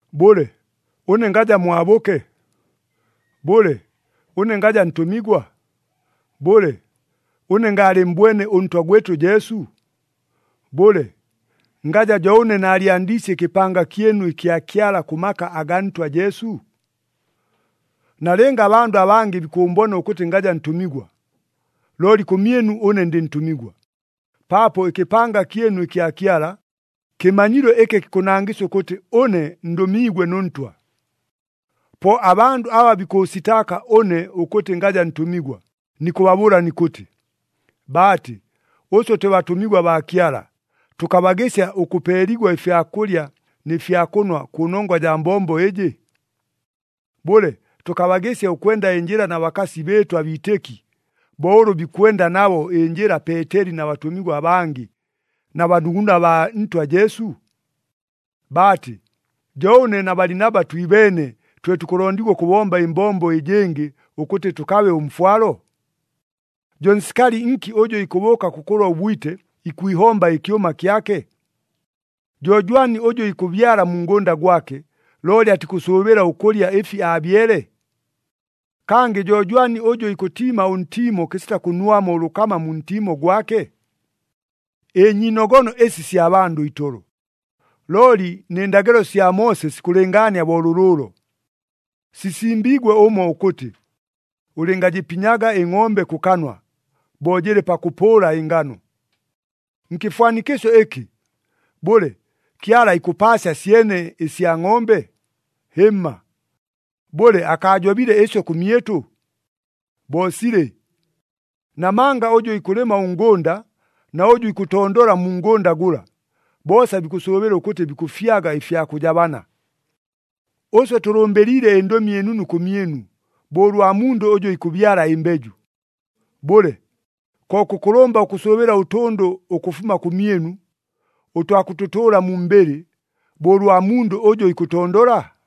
Bʉle, ʉne ngaja mwabʉke? Bʉle, ʉne ngaja ntʉmigwa? Bʉle, ʉne ngaalɨmmbwene ʉNtwa gwɨtʉ Jesu? Bʉle, ngaja jo ʉne naalyandiisye ɨkɨpanga kyɨnu ɨkya Kyala kʉ maka agaa Ntwa Jesu? Nalɨnga abandʉ abangɨ bikʉʉmbona ʉkʉtɨ ngaja ntʉmigwa, looli kʉmyɨnu ʉne ndɨ ntʉmigwa, paapo ɨkɨpanga kyɨnu ɨkya Kyala, kɨmanyilo ɨkɨ kikʉnangɨsya ʉkʉtɨ ʉne ndʉmiigwe nʉ Ntwa. Po abandʉ aba bikʉʉsitaaka ʉne ʉkʉtɨ ngaja ntʉmigwa, nikʉbabʉʉla nikʉtɨ, baatɨ, ʉswe twe batʉmigwa baa Kyala, tʉkabagɨsya ʉkʉpeeligwa ɨfya kʉlya nɨ fya kʉnwa kʉnongwa jaa mbombo ɨjɨ? Bʉle, tʉkabagɨsya ʉkwenda ɨnjɨla na bakasi bɨɨtʉ abiitɨki, bo ʉlʉ bikwenda nabo ɨnjɨla Peeteli na batʉmigwa abangɨ, na banuguna baa Ntwa Jesu? Baatɨ, jo ʉne na Balinaba twibeene, twe tukʉlondigwa ʉkʉbomba ɨmbombo ɨjɨngɨ ʉkʉtɨ tʉkabe ʉmfwalo? Jo nsikali nki ʉjʉ ikʉbʉʉka kʉkʉlwa ʉbwite, ikwihomba ɨkyʉma kyake? Jo jwani ʉjʉ ikʉbyala mu ngʉnda gwake, looli atikʉsʉʉbɨla ʉkʉlya ɨfi aabyele? Kangɨ jo jwani ʉjʉ ikʉtiima ʉntiimo kɨsita kʉnwamo ʉlʉkama mu ntiimo gwake? Ɨnyiinogono ɨsi sya bandʉ itolo. Looli nɨ ndagɨlo sya Moose sikʉlɨngaania bo lʉlʉʉlo. Sisimbiigwe ʉmo ʉkʉtɨ, “Ʉlɨngajɨpinyaga ɨngʼombe kʉ kanwa, bo jɨlɨ pakʉpʉʉla ɨnganu.” Nkɨfwanikɨsyo ɨkɨ, bʉle, Kyala ikʉpaasya syene ɨsya ngʼombe? Hɨmma! Bʉle, akaajobile ɨsyo kʉmyɨtʉ? Bo silɨ! Namanga ʉjʉ ikʉlɨma ʉngʉnda, na ʉjʉ ikʉtondola mu ngʉnda gʉla, boosa bikʉsʉʉbɨla ʉkʉtɨ bikʉfyaga ɨfya kʉjabana. Ʉswe tʉlʉmbɨliile ɨNdʉmi ɨNunu kʉmyɨnu, bo ʉlwa mundʉ ʉjʉ ikʉbyala ɨmbeju. Bʉle, ko kʉkʉlʉmba ʉkʉsʉʉbɨla ʉtʉndʉ ʉkʉfuma kʉmyɨnu, ʉtwa kʉtʉtʉʉla mu mbɨlɨ, bo ʉlwa mundʉ ʉjʉ ikʉtondola?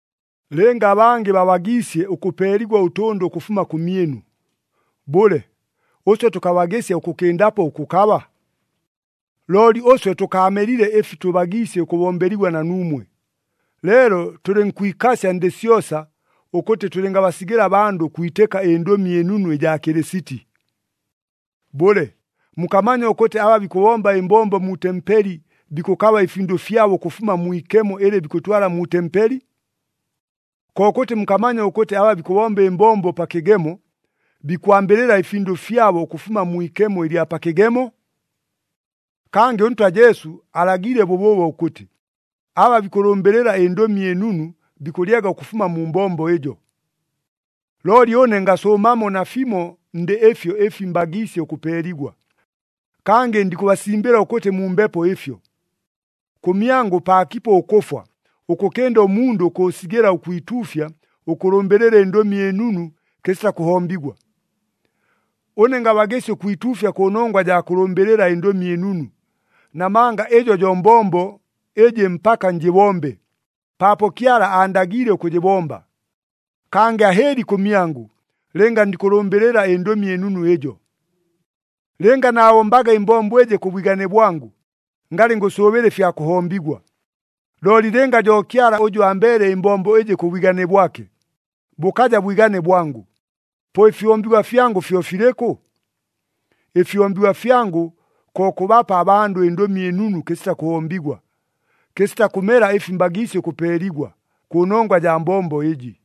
Lɨnga abangɨ babagiisye ʉkʉpeeligwa ʉtʉndʉ ʉkʉfuma kʉmyɨnu, bʉle, ʉswe tʉkabagɨsya ʉkʉkɨndapo ʉkʉkaba? Looli ʉswe tʉkaamelile ɨfi tʉbagiisye ʉkʉbombeligwa na nuumwe, leelo tʉlɨnkwikasya ndɨ syosa ʉkʉtɨ tʉlɨngabasigɨla abandʉ ʉkwitɨka ɨNdʉmi ɨNunu ɨjaa Kɨlɨsiti. Bʉle, mukamanya ʉkʉtɨ aba bikʉbomba ɨmbombo mu tempeli bikʉkaba ɨfindʉ fyabo ʉkʉfuma mwi ikemo ɨlɨ bikʉtwala mu tempeli? Kokʉtɨ mukamanya ʉkʉtɨ aba bikʉbomba ɨmbombo pa kɨgemo, bikwambɨlɨla ɨfindʉ fyabo ʉkʉfuma mwi ikemo ɨlya pa kɨgemo? Kangɨ ʉNtwa Jesu alagiile bʉbʉʉbo ʉkʉtɨ, aba bikʉlʉmbɨlɨla ɨNdʉmi ɨNunu bikʉlyaga ʉkʉfuma mu mbombo ɨjo. Looli ʉne ngasʉʉmamo nafimo ndɨ ɨfyo ɨfi mbagiisye ʉkʉpeeligwa. Kangɨ ndikʉbasimbɨla ʉkʉtɨ mumbepo ɨfyo. Kʉmyangʉ paakipo ʉkʉfwa, ʉkʉkɨnda ʉmundʉ ʉkʉʉsigɨla ʉkwituufya ʉkʉlʉmbɨlɨla ɨNdʉmi ɨNunu kɨsita kʉhombigwa. Ʉne ngabagɨsya ʉkwituufya kʉnongwa jaa kʉlʉmbɨlɨla ɨNdʉmi ɨNunu, namanga ɨjo jo mbombo ɨjɨ mpaka njɨbombe, paapo Kyala aandagiile ʉkʉjɨbomba. Kangɨ ahɨɨli kʉmyangʉ, lɨnga ndikʉlʉmbɨlɨla ɨNdʉmi ɨNunu ɨjo! Lɨnga naabombaga ɨmbombo ɨjɨ kʉ bwigane bwangʉ, ngalɨ ngʉsʉʉbɨla ɨfya kʉhombigwa. Looli lɨnga jo Kyala ʉjʉ ambeele ɨmbombo ɨjɨ kʉ bwigane bwake, bʉkaja bwigane bwangʉ, po ɨfihombigwa fyangʉ fyo filɨkʉ? Ɨfihombigwa fyangʉ ko kʉbapa abandʉ ɨNdʉmi ɨNunu kɨsita kʉhombigwa, kɨsita kʉmela ɨfi mbagiisye ʉkʉpeeligwa, kʉnongwa jaa mbombo ɨjɨ.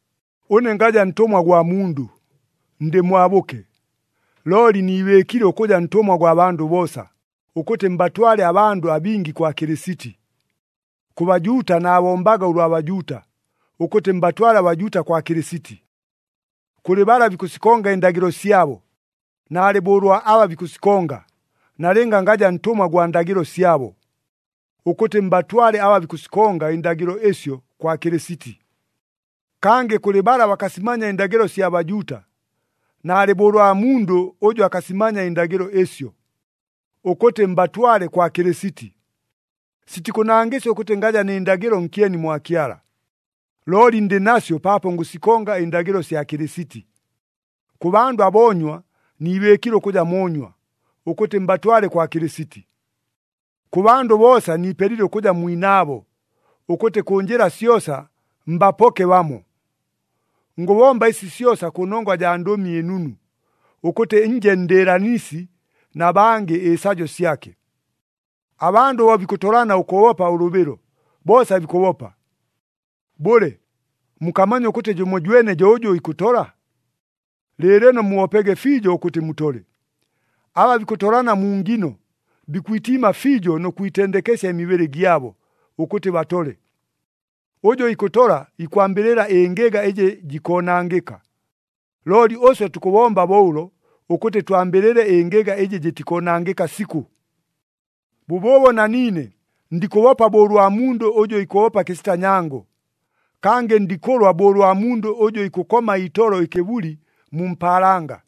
Ʉne ngaja ntʉmwa gwa mundʉ, ndɨ mwabʉke, looli niibɨɨkile ʉkʉja ntʉmwa gwa bandʉ boosa, ʉkʉtɨ mbatwale abandʉ abingi kwa Kɨlɨsiti. Kʉ Bajuuta naabombaga ʉlwa Bajuuta, ʉkʉtɨ mbatwale aBajuuta kwa Kɨlɨsiti. Kʉlɨ bala bikʉsikonga ɨndagɨlo syabo, naalɨ bo ʉlwa aba bikʉsikonga, nalɨnga ngaja ntʉmwa gwa ndagɨlo syabo, ʉkʉtɨ mbatwale aba bikʉsikonga ɨndagɨlo ɨsyo kwa Kɨlɨsiti. Kangɨ kʉlɨ bala bakasimanya ɨndagɨlo sya Bajuuta, naalɨ bo ʉlwa mundʉ ʉjʉ akasimanya ɨndagɨlo ɨsyo, ʉkʉtɨ mbatwale kwa Kɨlɨsiti. Sitikʉnangɨsya ʉkʉtɨ ngaja nɨ ndagɨlo nkyeni mwa Kyala, looli ndɨ nasyo paapo ngʉsikonga ɨndagɨlo sya Kɨlɨsiti. Kʉ bandʉ aboonywa, niibɨɨkile ʉkʉja moonywa, ʉkʉtɨ mbatwale kwa Kɨlɨsiti. Kʉ bandʉ boosa niipelile ʉkʉja mwinaabo, ʉkʉtɨ kʉ njɨla syosa mbapoke bamo. Ngʉbomba ɨsi syosa kʉnongwa jaa Ndʉmi ɨNunu, ʉkʉtɨ nje ndɨɨlanisi na bangɨ ɨsajo syake. Abandʉ bo bikʉtolana ʉkʉbopa ʉlʉbɨlo, boosa bikʉbopa. Bʉle, mukamanya ʉkʉtɨ jʉmojwene jo ʉjʉ ikʉtola? Lɨɨlɨno mubopege fiijo ʉkʉtɨ mutole. Aba bikʉtolana mu ngino, bikwitiima fiijo nʉ kwitendekesya ɨmibɨlɨ gyabo, ʉkʉtɨ batole. Ʉjʉ ikʉtola, ikwambɨlɨla ɨngɨga ɨjɨ jikoonangɨka. Looli ʉswe tukʉbomba bo ʉlo, ʉkʉtɨ twambɨlɨle ɨngɨga ɨjɨ jɨtikoonangɨka sikʉ. Bʉbʉʉbo na niine ndikʉbopa bo ʉlwa mundʉ ʉjʉ ikʉbopa kɨsita nyango, kangɨ ndikʉlwa bo ʉlwa mundʉ ʉjʉ ikʉkoma itolo ɨkɨbuli mu mpaalanga.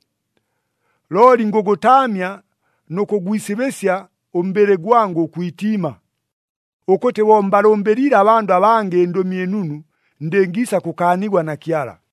Looli ngʉgʉtaamya nʉ kʉgwisibɨsya ʉmbɨlɨ gwangʉ ʉkwitiima, ʉkʉtɨ bo mbalʉmbɨliile abandʉ abangɨ ɨNdʉmi ɨNunu, ndɨngiisa kʉkaanigwa na Kyala.